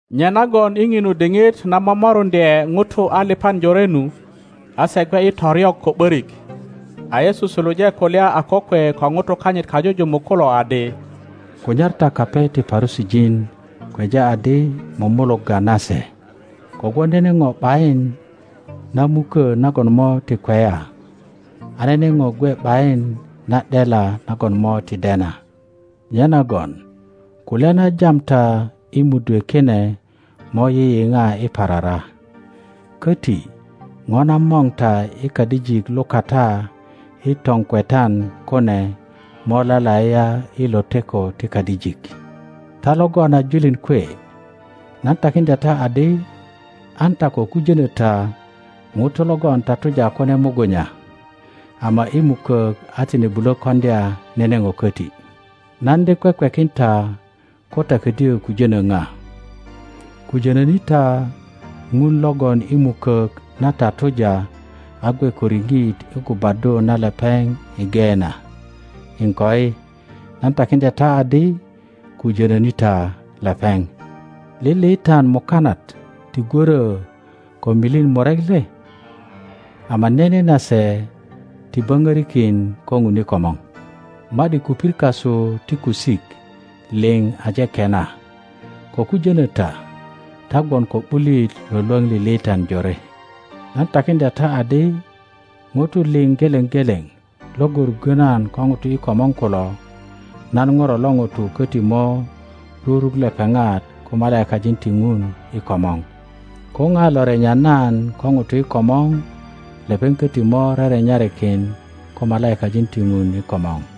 Nyenagon i ŋinu diŋit na momoruŋdye ŋutu aliŋan jorenu, a se gwe i toryok ko ’borik, a Yesu suluje kulya a kokwe ko ŋutu kanyit kajujumuk kulo adi, Kunyar ta kape ti Parusijin, kweja adi mumulugga nase. Kogwon nene ŋo ’bayin na mukö nagon mo ti kweya, a nene ŋo gwe ’bayin na ’dela nagon mo ti dena; nyenagon kulya na jam ta i mudwe kine mo yiyiŋa i parara, köti ŋo na mor ta i kadijik lukata i toŋkwetan kune mo lalaiya i loteko ti kadijik. Ta logon a julin kwe, nan takiŋdya ta adi, An ta ko ktijönö ta ŋutu logon tatuja kune mugunya, ama i mukök a tine bulö koŋdya nene ŋo köti. Nan de kwekwekin ta ko ta ködyö kujönö ŋa: kujono ni ta Ŋun logon i mukok na tatuja a gwe ko riŋit i gubaddu na lepeŋ i Geena. Iŋkoi, nan takiŋdya ta adi, kujono ni ta lepeŋ. Liliitan muka nat ti gworo ko milin murek le? Ama nene nase ti boŋorikin ko Ŋun i komor. Ma ’di kupir kasu ti kusik liŋ aje kena. Kokujono ta; ta gwon ko ’bulit lwölwöŋ liliitan jore. Nan takiŋdya ta adi, ŋutu liŋ geleŋ geleŋ logon ruggo nan ko ŋutu i komor kulo, nan Ŋuro lo ŋuto köti mo ruruk lepeŋat ko malaikajin ti Ŋun i komor. Ko ŋa lo renya nan ko ŋutu i komor, lepeŋ koti mo rerenyarikin ko malaikajin ti Ŋun i komor.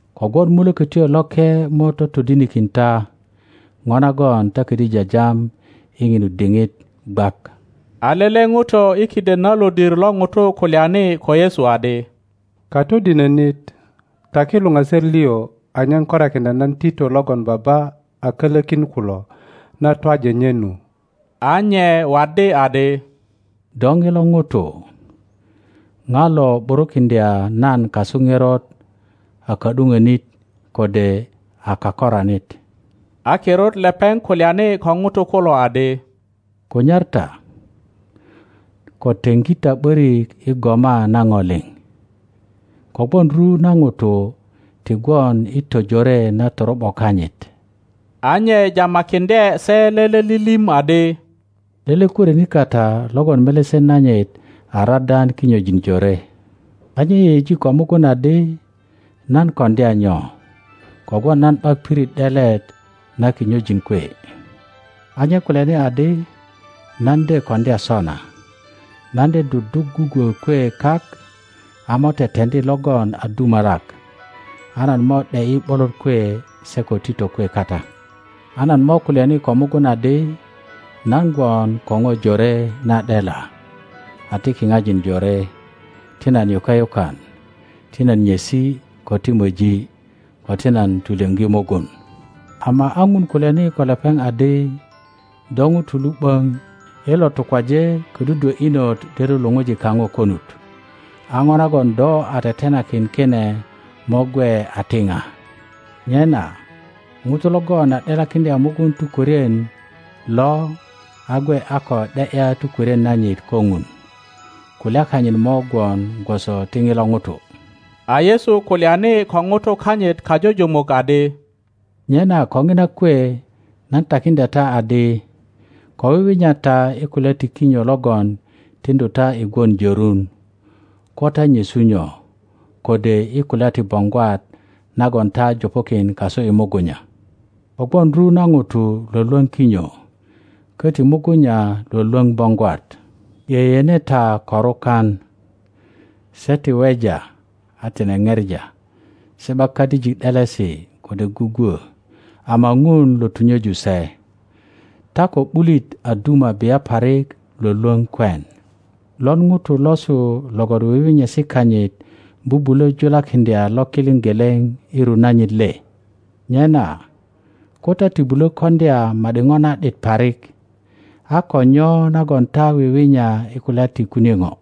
kogwon Mulökötyo Loke mo totodinikin ta ŋo nagon ta kodyo jajam i ŋinu diŋit gwak. A lele ŋuto i kiden na lodir lo ŋutu kulyani ko Yesu adi, Katodinonit, taki luŋaser liŋ anyen korakiŋdya nan tito logon baba a kölokin kulo na twaji nye nu. A nye waddi adi, Do ŋilo ŋuto, ŋa lo ’burukiŋdya nan kasu ŋerot a ka ’duŋonit kode a kakoranit? A kirut lepeŋ kulyani ko ŋutu kulo adi, Kunyar ta, ko teŋgi ta ’borik i goma na ŋo liŋ, kogwon ru na ŋuto ti gwon i tojore na toro ’bo kanyit. a nye jamakiŋdye se lele lilim adi, Lele kworinit kata logon melesen nanyit a radan kinyojin jore. A nye yeyeji ko mugun adi, Nan koŋdya nyo, kogwon nan ’bak pirit ’delet na kinyojin kwe? A nye kulyani adi, Nan de koŋdya sona: nan de duduk gugwo kwe kak a mo teteŋdi logon a dumalak, a nan mo ’de ’yi ’bolot kwe se ko tito kwe kata; a nan mo kulyani ko mugun adi, Nan gwon ko ŋo jore na ’dela a ti kiŋajin jore. Ti nan yuke yukan, ti nan nyesi, ko ti moji, ko ti nan tulyoŋgi mugun. Ama a Ŋun kulyani ko lepeŋ adi, Do ŋuto lu ’böŋ, i lo tukwaje kodudwö inot de lulu ŋun kaŋo konut. A ŋo nagon do a tetenakin kine mo gwe a ti ŋa? Nyena ŋuto logon a ’delakiŋdya mugun tukwörien lo a gwe a ko ’de ’ya tukwörien nanyit ko Ŋun, kulya kanyit mo gwon gwoso ti ŋilo ŋuto. A Yesu kulyani ko ŋutu kanyit kajujumuk adi, Nyena ko ŋina kwe nan takiŋdya ta adi, Ko wiwinya ta i kulya ti kinyo logon tiŋdu ta i gwon jorun, ko ta nyesu nyo, kode i kulya ti boŋgwat nagon ta jupukin kasu i mugunya. Kogwon ru na ŋutu lwölwoŋ kinyo, koti mugunya lwölwoŋ boŋgwat. Yeyene ta korukan: se ti weja a tine ŋepa; se ’bak kadijik ’delesi kode gugwo; ama Ŋun lo tunyeju se. Ta ko ’bulit a duma bia parik lwolwoŋ kwen! Lon ŋuto losu logon wiwinyesi kanyit bubulo julakiŋdya lokiliŋ geleŋ i ru nanyit le? Nyena ko ta ti bulo koŋdya ma ’di ŋo na ’dit parik, a ko nyo nagon ta wiwinya i kulya ti kunie ŋo?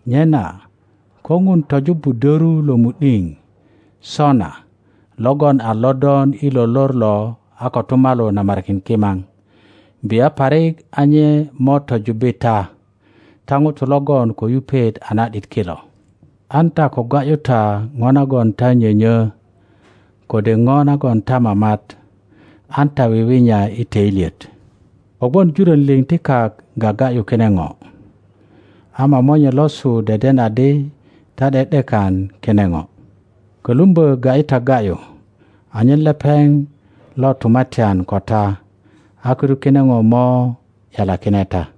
Nyena ko Ŋun tojubbu döru lo mu ’diŋ sona logon a lodon i lo lor lo a kotumalu namarikin kimaŋ, bia parik a nye mo tojubbi ta, ta ŋutu logon ko yupet a na ’dit kilo! An ta ko ga ’yu ta ŋo nagon ta nyonyö, kode ŋo nagon ta mamat; an ta wiwinya i toilyet. Kogwon jurön liŋ ti kak gaga ’yu kine ŋo; ama Monye losu deden adi ta ’de ’dekan kine ŋo. Kölumbö ga ’yi ta ga ’yu anyen lepeŋ lo tumatyan ko ta, a kirut kine ŋo mo ’yalakine ta.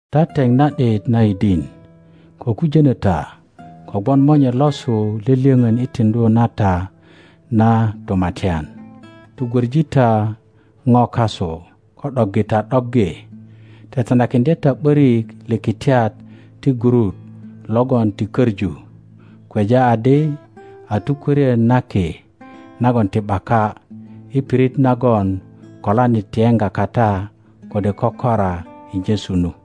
Ta teŋ na ’dit na yidin, ko kujonö ta, kogwon Monye losu lyölyöŋön i tiŋdu na ta na Tumatyan. Tugwoŋi ta ŋo kasu, ko ’doggi ta ’doggi. Tetenakiŋdye ta ’borik likitiet ti gurut logon ti koŋu, kweja adi a tukworien na ki nagon ti ’baka, i pirit nagon kolanit ti yeŋga kata kode kökora i nyesu nu.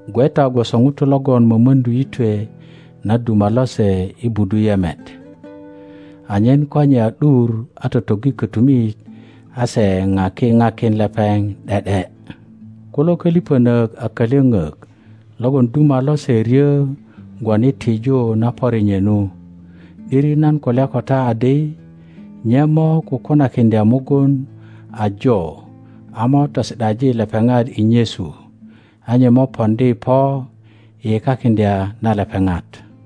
gwe ta gwoso ŋutu logon mömöŋdu yitwe na duma lose i budu yeme, anyen ko nye a ’dur a totoggi kötumit, a se paki pakin lepeŋ ’de ’de. Kulo koliŋönök a kalyoŋok logon duma lose ryö gwon i tiju na pöri nye nu; ’diri nan kulya ko ta adi nye mo kukunakiŋdya mugun ajo a mo tosi ’daji lepeŋat i nyesu, a nye mo poŋdi po i yekakiŋdya na lepeŋat.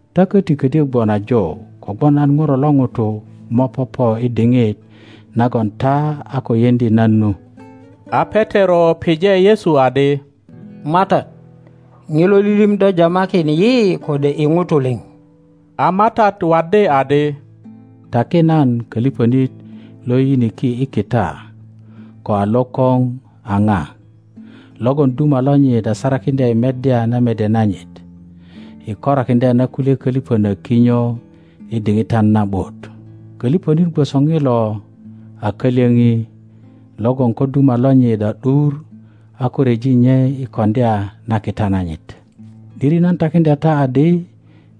Ta köti ködyo gwon ajo, kogwon nan ŋuro lo ŋuto mo popo i diŋit nagon ta a ko yeŋdi nan nu. A Petero pije Yesu adi, MATAT, ŋilo lilim do jamakin yi kode i ŋutu liŋ? A MATAT waddi adi, Taki nan, köliŋönit lo yiyiniki i kita ko a lokoŋ a ŋa, logon duma lonyit a sarakiŋdya i meddya na mede nanyit, i korakiŋdya na kulye köliŋönök kinyo i diŋitan na ’but? Koliŋonit gwoso ŋilo a kalyöŋi logon ko duma lonyit a ’dur a ko ryeji nye i koŋdya na kita nanyit. ’Diri nan takiŋdya ta adi,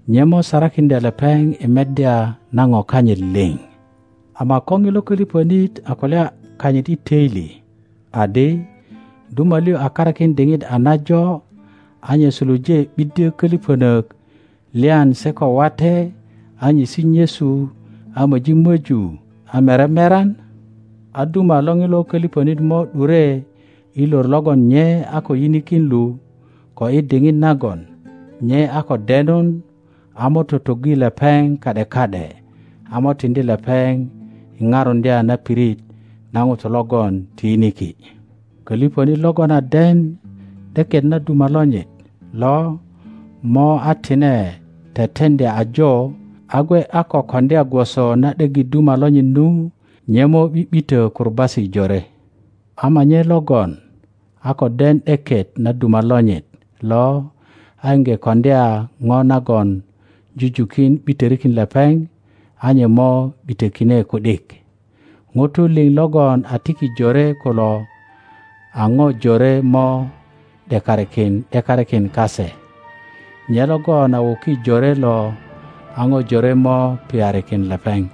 nye mo sarakiŋdya lepeŋ i meddya na ŋo kanyit liŋ. Ama ko ŋilo koliŋonit a kulya kanyit i toili adi, Duma liŋ a karakin diŋit a najo, a nye suluje ’biddyo köliŋönök lyan se ko wate, a nyesi nyesu, a möji möju, a mere meran, a duma lo ŋilo köliŋönit mo ’dure i lor logon nye a ko yinikin lu ko i diŋit nagon nye a ko denun, a mo totoggi lepeŋ ka ’de ka ’de, a mo tiŋdi lepeŋ i parundya na pirit na ŋutu logon ti yiniki. Koliŋonit logon a den ’deket na duma lonyit lo ama a tine teteŋdya ajo, a gwe a ko koŋdya gwoso na ’deggi duma lonyit nu, nye mo ’bi ’bitö kurubasi jore; ama nye logon a ko den ’deket na duma lonyit lo a iŋge koŋdya ŋo nagon jujukin ’bitorikin lepeŋ, a nye mo ’bitökine ku ’dik. Ŋutu liŋ logon a tiki jore kulo a ŋo jore mo ’dekarikin ’dekarikin kase; nye logon a wuki jore lo a ŋo jore mo piyarikin lepeŋ.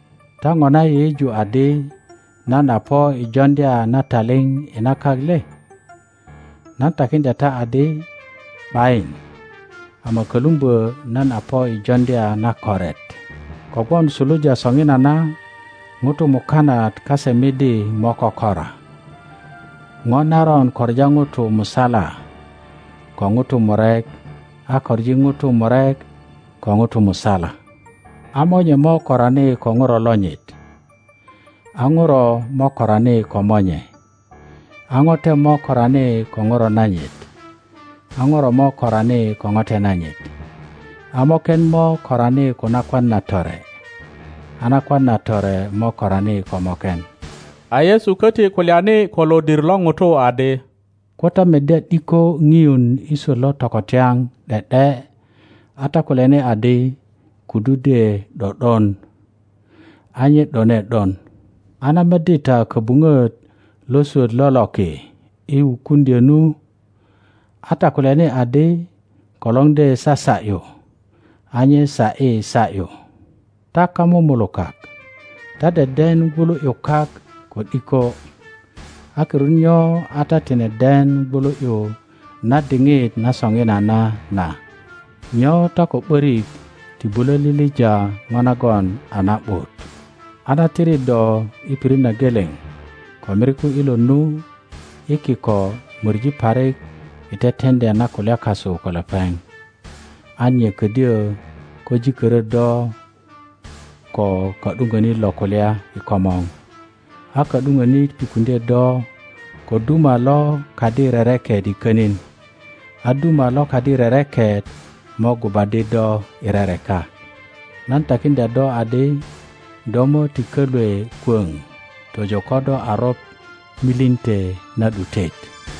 Ta ŋona yeyeju adi nan a po i joŋdya na taliŋ i na kak le? Nan takiŋdya ta adi, ’Bayin, ama kölumbö nan a po i joŋdya na koret! Kogwon suluja soŋinana ŋutu mukanat kase midi mo kökora, ŋo naron koŋa ŋutu musala ko ŋutu murek, a koŋi ŋutu murek ko ŋutu musala; a monye mo korani ko ŋuro lonyit, a ŋuro mo korani ko monye; a ŋote mo korani ko ŋuro nanyit, a ŋuro mo korani ko ŋote nanyit; a moken mo korani ko nakwan na tore, a nakwan na tore mo korani ko moken. A Yesu köti kulyani ko lodir lo ŋutu adi, Ko ta meddya ’diko ŋiun i swöt lo tokotyaŋ ’de ’de a ta kulyani adi, Kudu de ’do ’don, a nye ’done ’don. A na meddi ta köbuŋöt lo swöt lo loki i wukuŋdyö nu, a ta kulyani adi, Kolor de sasa ’yu, a nye sa ’yi sa ’yu. Ta kamumulukak, ta deden gwulu ’yu kak ko ’diko; a kirut nyo a ta tine den wulu ’yu na diŋit na soŋinana na? Nyo ta ko ’borik ti bulö lilija ŋo nagon a na ’but? A na tiri do i pirit na geleŋ ko miriku ilot nu, i kiko mori parik i teteŋdya na kulya kasu ko lepeŋ, an nye ködyö ko jikörö do ko ka ’duŋonit lo kulya i komor, a ka ’duŋönit ŋutukiŋdye do ko duma lo kadi rereket i könin, a duma lo kadi rereket mo gubaddi do i rereka. Nan takiŋdya do adi, do mo ti kolwe kwoŋ tojo ko do a roŋ milinte na ’dutet.